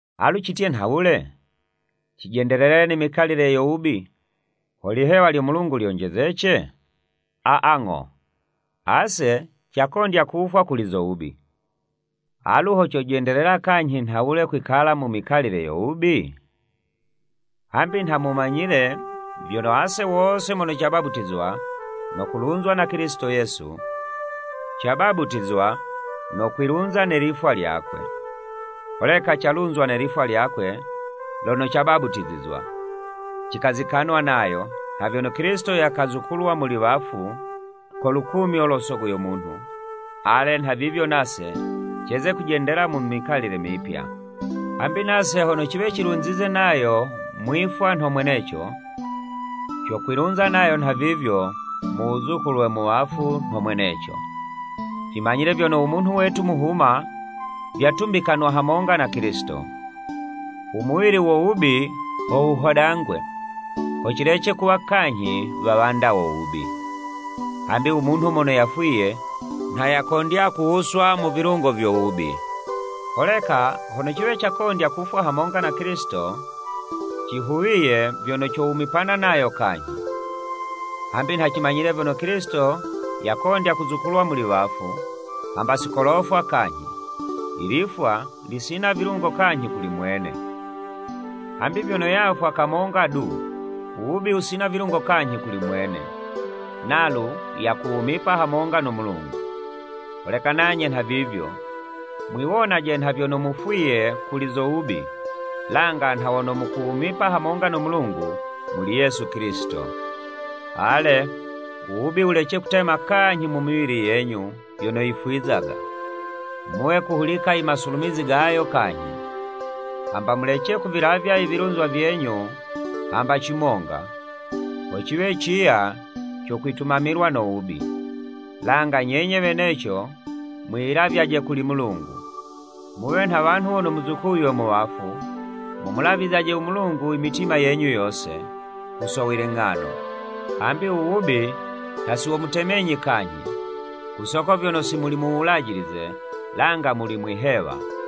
Alu citye nhawule? Cijendelele ne mikalile yo wubi, ho lihewa lyo Mulungu lyonjezece? Aa, ng'o! Ase cakondya kufwa kuli zo wubi, alu ho cojendelela kanyhi nhawule kwikala mu mikalile yo wubi? Hambi nha mumanyile, vyono ase wose mono cabaputizwa, no kulunzwa na Kilisito Yesu, cabaputizwa no kwilunza ne lifwa lyakwe. Holeka calunzwa ne lifwa lyakwe, lono cabaputizizwa, cikazikanwa nayo, nha vyono Kilisito yazukulwa muli wafu ko lukumyo lo Sogo yo munhu, ale nhavivyo nase, ceze kujendela mu mikalile mipya. Hambi nase hono ciwe cilunzize nayo mwifwa nho mweneco, cokwilunza nayo nhavivyo mu wuzukulwe mu wafu nho mweneco. Cimanyile vyono, u munhu wetu muhuma, vyatumbikanwa hamonga na Kilisito, u muwili wo wubi ho wuhodangwe, ho cilece kuwa kanyhi wawanda wo wubi. Hambi u munhu mono yafwiye, nha yakondya kuwuswa mu vilungo vyo wubi. Holeka hono ciwe cakondya kufwa hamonga na Kilisito, cihuwiye vyono cowumipana nayo kanyhi. Hambi nha cimanyile vyono Kilisito yakondya kuzukulwa muli wafu, hamba si kolofwa kanyhi, ilifwa lisina vilungo kanyhi kuli mwene. Hambi vyono yafwa, kamonga du, u wubi wusina vilungo kanyhi kuli mwene, nalu yakuwumipa hamonga no Mulungu. Holeka nanye nhavivyo, mwiwonaje nha vyono mufwiye kuli zo wubi, langa nha wono mukuwumipa hamonga no Mulungu, muli Yesu Kilisito. Ale u wubi wulece kutema kanyhi mu miwili yenyu yono yifwizaga, muwe kuhulika imasulumizi gayo kanyhi. Hamba mulece kuvilavya ivilunzwa vyenyu hamba cimonga, ho ciwe ciya co kwitumamilwa no wubi. Langa nyenye weneco mwiyilavyaje kuli Mulungu, muwe nha wanhu wono muzukuywe mu wafu, mumulavizyaje u Mulungu imitima yenyu yose, ku so wiling'ano. Hambi uwubi nha si womutemenyi kanyhi, ku soko vyono si muli mu Wulajilize, langa muli mwi'hewa.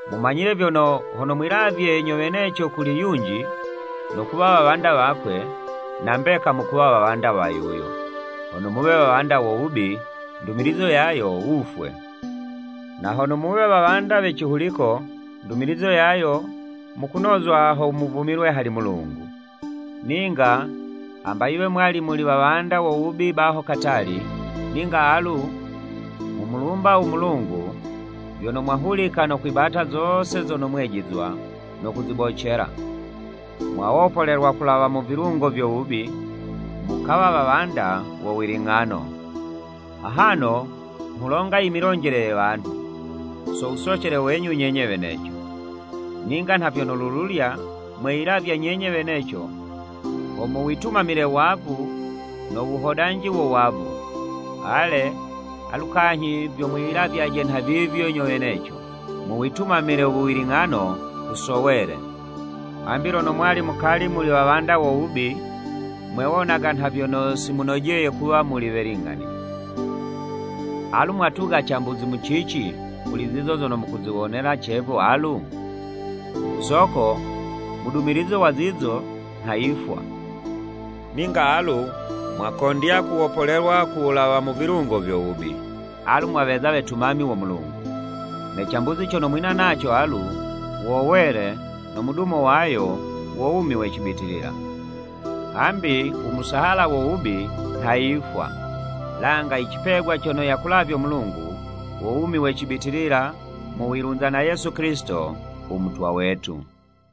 Mumanyile vyono, hono mwiyilavye nyo weneco kuli yunji, no kuwa wawanda wakwe, na mbeka mukuwa wawanda wa yuyo, hono muwe wawanda wo wubi, ndumilizo yayo wufwe, na hono wuwe wawanda we cihuliko, ndumilizo yayo, mukunozwa ho muvumilwe hali Mulungu. Ninga, hamba yiwe mwali muli wawanda wo wubi baho katali, ninga alu, nghumulumba u Mulungu vyono, mwahulika no kwibata zose zono mwejizwa no kuzibocela. Mwawopolelwa kulawa mu vilungo vyo wubi, mukawa wawanda wo wiling'ano. Ahano nghulonga imilonjele ye wanhu, so wusocele wenyu nyenye weneco. Ninga nha vyono lululya, mweyilavya nyenye weneco ho muwitumamile wavu no wuhodanji wo wavu, ale, alu kanyhi vyo mwiyilavyaje nhavivyo nyo weneco, muwitumamile uwiling'ano, ku so wele. Hambi lono mwali mukali muli wawanda wo wubi, mwewonaga nha vyono si munojeye kuwa muli we ling'ani. Alu mwatuga cambuzi mu cici, kuli zizo zono mukuziwonela cevu alu? Ku soko mudumilizo wa zizo, nha yifwa. Ninga alu mwakondya kuwopolelwa ku wulawa mu vilungo vyo wubi, alu mwaweza wetumami wo Mulungu, ne cambuzi cono mwina naco alu, wo wele, no mudumo wayo, wo wumi we cibitilila. Hambi u musahala wo wubi nha yifwa, langa icipegwa cono yakulavyo Mulungu, wo wumi we cibitilila mu wilunza na Yesu Kilisito u Mutwa wetu.